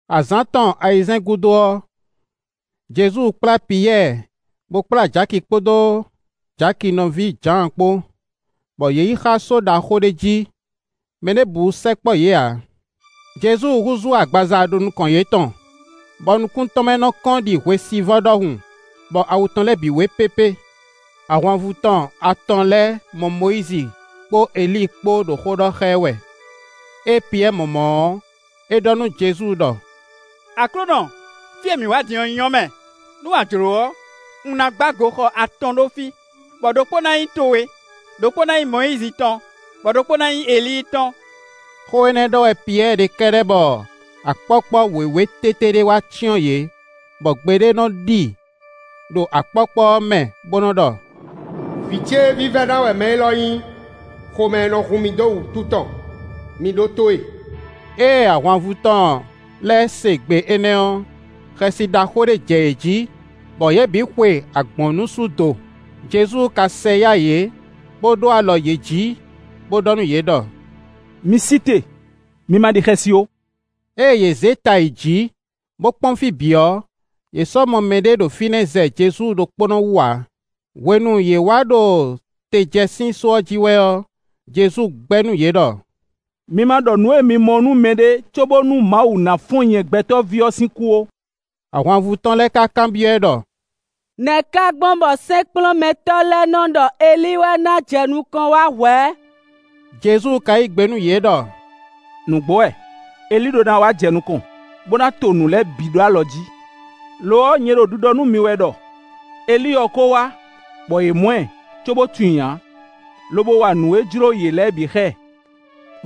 Azǎn tɔn ayizɛ́n gúdo ɔ́, Jezu kplá Piyɛ́ɛ, bó kplá Jaki kpódó Jaki nɔví Jǎan kpó, bɔ yě yi xá só ɖaxó ɖé jí; mɛ ɖěbǔ sɛkpɔ́ yě ǎ. Jezu húzú agbaza ɖo nukɔn yětɔn, bɔ nukún tɔn mɛ nɔ́ kɔ́n ɖi hwesivɔ́ ɖɔhun; bɔ awu tɔn lɛ́ɛ wé pépé. Ahwanvú tɔn atɔn lɛ́ɛ mɔ Mɔyízi kpó Elíi kpó ɖo xó ɖɔ xá ɛ wɛ. Ée Piyɛ́ɛ mɔ mɔ̌ ɔ́, é ɖɔ nú Jezu ɖɔ: “Aklúnɔ, fí e mǐ wǎ din ɔ́ nyɔ́ mɛ! Nú a jlǒ ɔ́, un ná gbá goxɔ atɔn ɖó fí, bɔ ɖokpó ná nyí towe, ɖokpó ná nyí Mɔyízi tɔn, bɔ ɖokpó ná nyí Elíi tɔn.” Xó énɛ́ ɖɔ wɛ Piyɛ́ɛ ɖe kɛ́ɖɛ́ bɔ akpɔ́kpɔ́ wěwé tété ɖé wá cyɔ́n yě, bɔ gbe ɖé nɔ́ ɖi ɖo akpɔ́kpɔ́ ɔ́ mɛ, bó nɔ́ ɖɔ: “Vǐ ce vívɛ́ná wɛ mɛ élɔ́ nyí; xomɛ nɔ hun mì dó wǔtu tɔn; mi ɖótó e.” Ée ahwanvú tɔn lɛ́ɛ se gbe énɛ́ ɔ́, xɛsi ɖaxó ɖé jɛ yě jí, bɔ yě bǐ xwe agbɔ̌nnusú do. Jezu ka sɛ yá yě, bó ɖó alɔ yě jí, bó ɖɔ nú yě ɖɔ: “Mi sí te, mi ma ɖi xɛsi ó.” Ée yě zé ta yi jǐ, bó kpɔ́n fí bǐ ɔ́, yě sɔ́ mɔ mɛɖé ɖo fínɛ́ zɛ Jezu ɖokpónɔ wú ǎ. Hwenu yě wá ɖo te jɛ sín só ɔ́ jí wɛ ɔ́, Jezu gbɛ́ nú yě ɖɔ: “Mi ma ɖɔ nǔ e mi mɔ ɔ́ nú mɛɖé cóbónú Mawu ná fɔ́n nyɛ Gbɛtɔ́ví ɔ́ sín kú ó.” Ahwanvú tɔn lɛ́ɛ ka kanbyɔ́ ɛ ɖɔ: “Nɛ̌ ka gbɔn bɔ sɛ́nkplɔ́nmɛtɔ́ lɛ́ɛ nɔ́ ɖɔ Elíi wɛ ná jɛ nukɔn wá hwɛ̌?” Jezu ka yí gbe nú yě ɖɔ: “Nǔgbó wɛ, Elíi ɖó ná wá jɛ nukɔn, bó ná to nǔ lɛ́ɛ bǐ ɖó alɔ jí. Lo ɔ́, nyɛ ɖo ɖiɖɔ nú mi wɛ ɖɔ: Elíi ɔ́ ko wá, bɔ yě mɔ ɛ, cóbó tunwun i ǎ, lobo wa nǔ e jló yě lɛ́ɛ bǐ xá ɛ.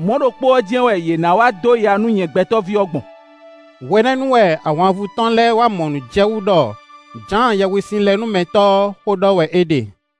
Mɔ̌ ɖokpó ɔ́ jɛ́n wɛ yě ná wá dó ya nú nyɛ Gbɛtɔ́ví ɔ́ gbɔn.” Hwenɛ́nu wɛ ahwanvú tɔn lɛ́ɛ wá mɔ nǔ jɛ wú ɖɔ Jǎan Yɛhwesinlɛnúmɛtɔ́ ɔ́ xó ɖɔ wɛ é ɖe.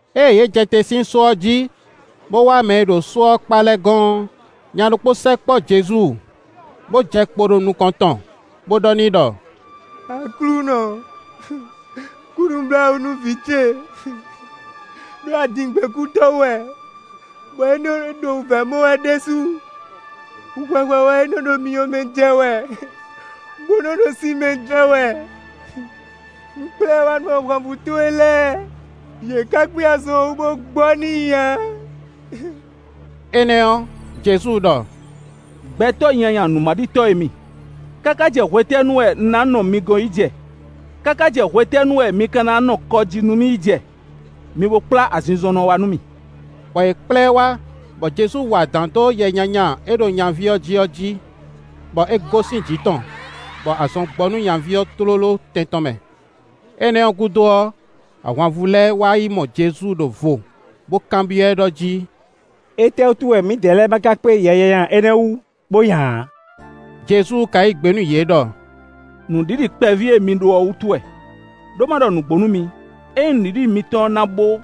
Ée yě jɛ te sín só ɔ́ jí, bó wá mɛ e ɖo só ɔ́ kpá lɛ́ɛ gɔ́n ɔ́, nya ɖokpó sɛkpɔ́ Jezu, bó jɛ kpo ɖo nukɔn tɔn, bó ɖɔ n'i ɖɔ: “Aklúnɔ! Kú nǔbláwǔ nú vǐ ce, ɖó adǐngbekútɔ́ wɛ, bɔ é ɖo wǔvɛ́ mɔ wɛ ɖésú; hwɛhwɛ wɛ é nɔ́ ɖo myɔ mɛ jɛ wɛ, bó nɔ́ lɛ́ ɖo sin mɛ jɛ wɛ. Un kplá ɛ wá nú ahwanvú towe lɛ́ɛ, yě ká kpé azɔn ɔ́ wú, bó gbɔ n'i ǎ.” Énɛ́ ɔ́, Jezu ɖɔ: “Gbɛtɔ́ nyanya nǔmaɖitɔ́ e mi, káká jɛ hwetɛ́nu wɛ un ná nɔ mi gɔ́n yi jɛ? Káká jɛ hwetɛ́nu wɛ mi ka ná nɔ kɔ jí nú mì yi jɛ? Mi bo kplá azinzɔnnɔ ɔ́ wá nú mì.” Bɔ yě kplá ɛ wá, bɔ Jezu wa adǎn dó yɛ nyanya e ɖo nyaví ɔ́ jí ɔ́ jí, bɔ é gosín jǐ tɔn, bɔ azɔn gbɔ nú nyaví ɔ́ tlóló tɛn tɔn mɛ. Énɛ́ ɔ́ gúdo ɔ́, ahwanvú lɛ́ɛ wá yi mɔ Jezu ɖó vo, bó kanbyɔ́ ɛ ɖɔ jí: “Étɛ́wútu wɛ mǐdɛɛ lɛ́ɛ ma ka kpé yɛ nyanya énɛ́ ɔ́ wú, bó nya ǎ?” Jezu ka yí gbe nú yě ɖɔ: “Nǔɖiɖi kpɛví e mi ɖó ɔ́ wútu wɛ; ɖó ma ɖɔ nǔgbó nú mi, ényí nǔɖiɖi mitɔn na bo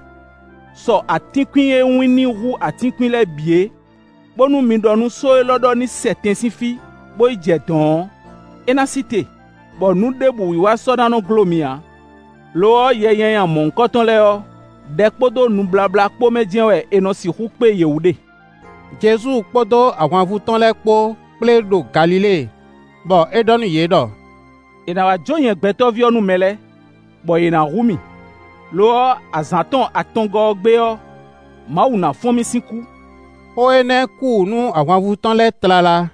sɔ atínkwín e wínní hú atínkwín lɛ́ɛ bǐ é, bónú mi ɖɔ nú só élɔ́ ɖɔ ní sɛ tɛn sín fí, bó yi jɛ dɔ̌n ɔ́, é ná sí te; bɔ nǔ ɖěbǔ wiwa sɔ ná nɔ́ gló mi ǎ. [ Lo ɔ́, yɛ nyanya mɔ̌hunkɔtɔn lɛ́ɛ ɔ́, ɖɛ kpódó nubláblá kpó mɛ jɛ́n wɛ è nɔ sixú kpé yě wú ɖe.”] Jezu kpódó ahwanvú tɔn lɛ́ɛ kpó kplé ɖo Galilée, bɔ é ɖɔ nú yě ɖɔ: “È nǎ wá jó nyɛ Gbɛtɔ́ví ɔ́ nú mɛ lɛ́ɛ; bɔ yě ná hu mì; lo ɔ́, azǎn tɔn atɔngɔ́ ɔ́ gbe ɔ́, Mawu ná fɔ́n mì sín kú.” Xó énɛ́ kú wǔ nú ahwanvú tɔn lɛ́ɛ tlala.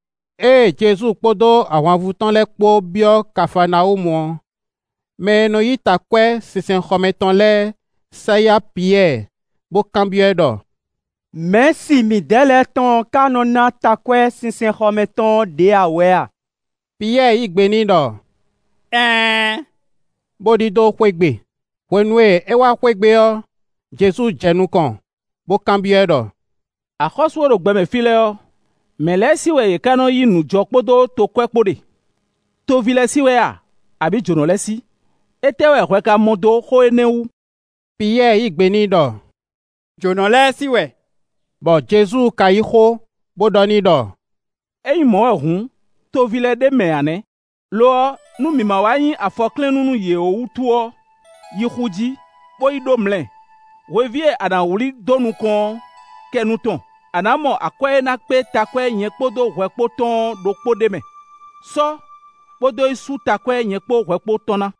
Ée Jezu kpódó ahwanvú tɔn lɛ́ɛ kpó byɔ́ Kafaanawúmu ɔ́, mɛ e nɔ yí takwɛ́ sinsɛnxɔ mɛ tɔn lɛ́ɛ sɛ yá Piyɛ́ɛ bó kanbyɔ́ ɛ ɖɔ: “Mɛ̌si midɛɛ lɛ́ɛ tɔn ka nɔ́ ná takwɛ́ sinsɛnxɔ mɛ tɔn ɔ́ ɖě ǎ wɛ a?” Piyɛ́ɛ yí gbe n'i ɖɔ: “Ɛɛn,” bó ɖidó xwé gbe. Hwenu e é wá xwé gbe ɔ́, Jezu jɛ nukɔn, bó kanbyɔ́ ɛ ɖɔ: “Axɔ́sú e ɖo gbɛmɛ fí lɛ́ɛ ɔ́, mɛ̌ lɛ́ɛ sí wɛ yě ká nɔ́ yí nǔjɔ kpódó tokwɛ́ kpó ɖe? Toví lɛ́ɛ sí wɛ a, abǐ jǒnɔ lɛ́ɛ sí? Étɛ́ wɛ hwɛ ka mɔ dó xó énɛ́ wú?” Piyɛ́ɛ yí gbe n'i ɖɔ: “Jǒnɔ lɛ́ɛ sí wɛ.” Bɔ Jezu ka yí xó, bó ɖɔ n'i ɖɔ: “Ényí mɔ̌ wɛ hǔn, toví lɛ́ɛ ɖ'é mɛ ǎ nɛ́. Lo ɔ́, nú mǐ ma wá nyí afɔklɛ́nnú nú yě ó wútu ɔ́, yi xu jí, bó yi ɖó mlɛ; hweví e a nǎ wlí dó nukɔn ɔ́, kɛ nu tɔn, a ná mɔ akwɛ́ e ná kpé takwɛ́ nyɛ kpó hwɛ kpó tɔn ɔ́ ɖokpó ɖ'é mɛ; sɔ́, bó dó yi sú takwɛ́ nyɛ kpó hwɛ kpó tɔn ná.”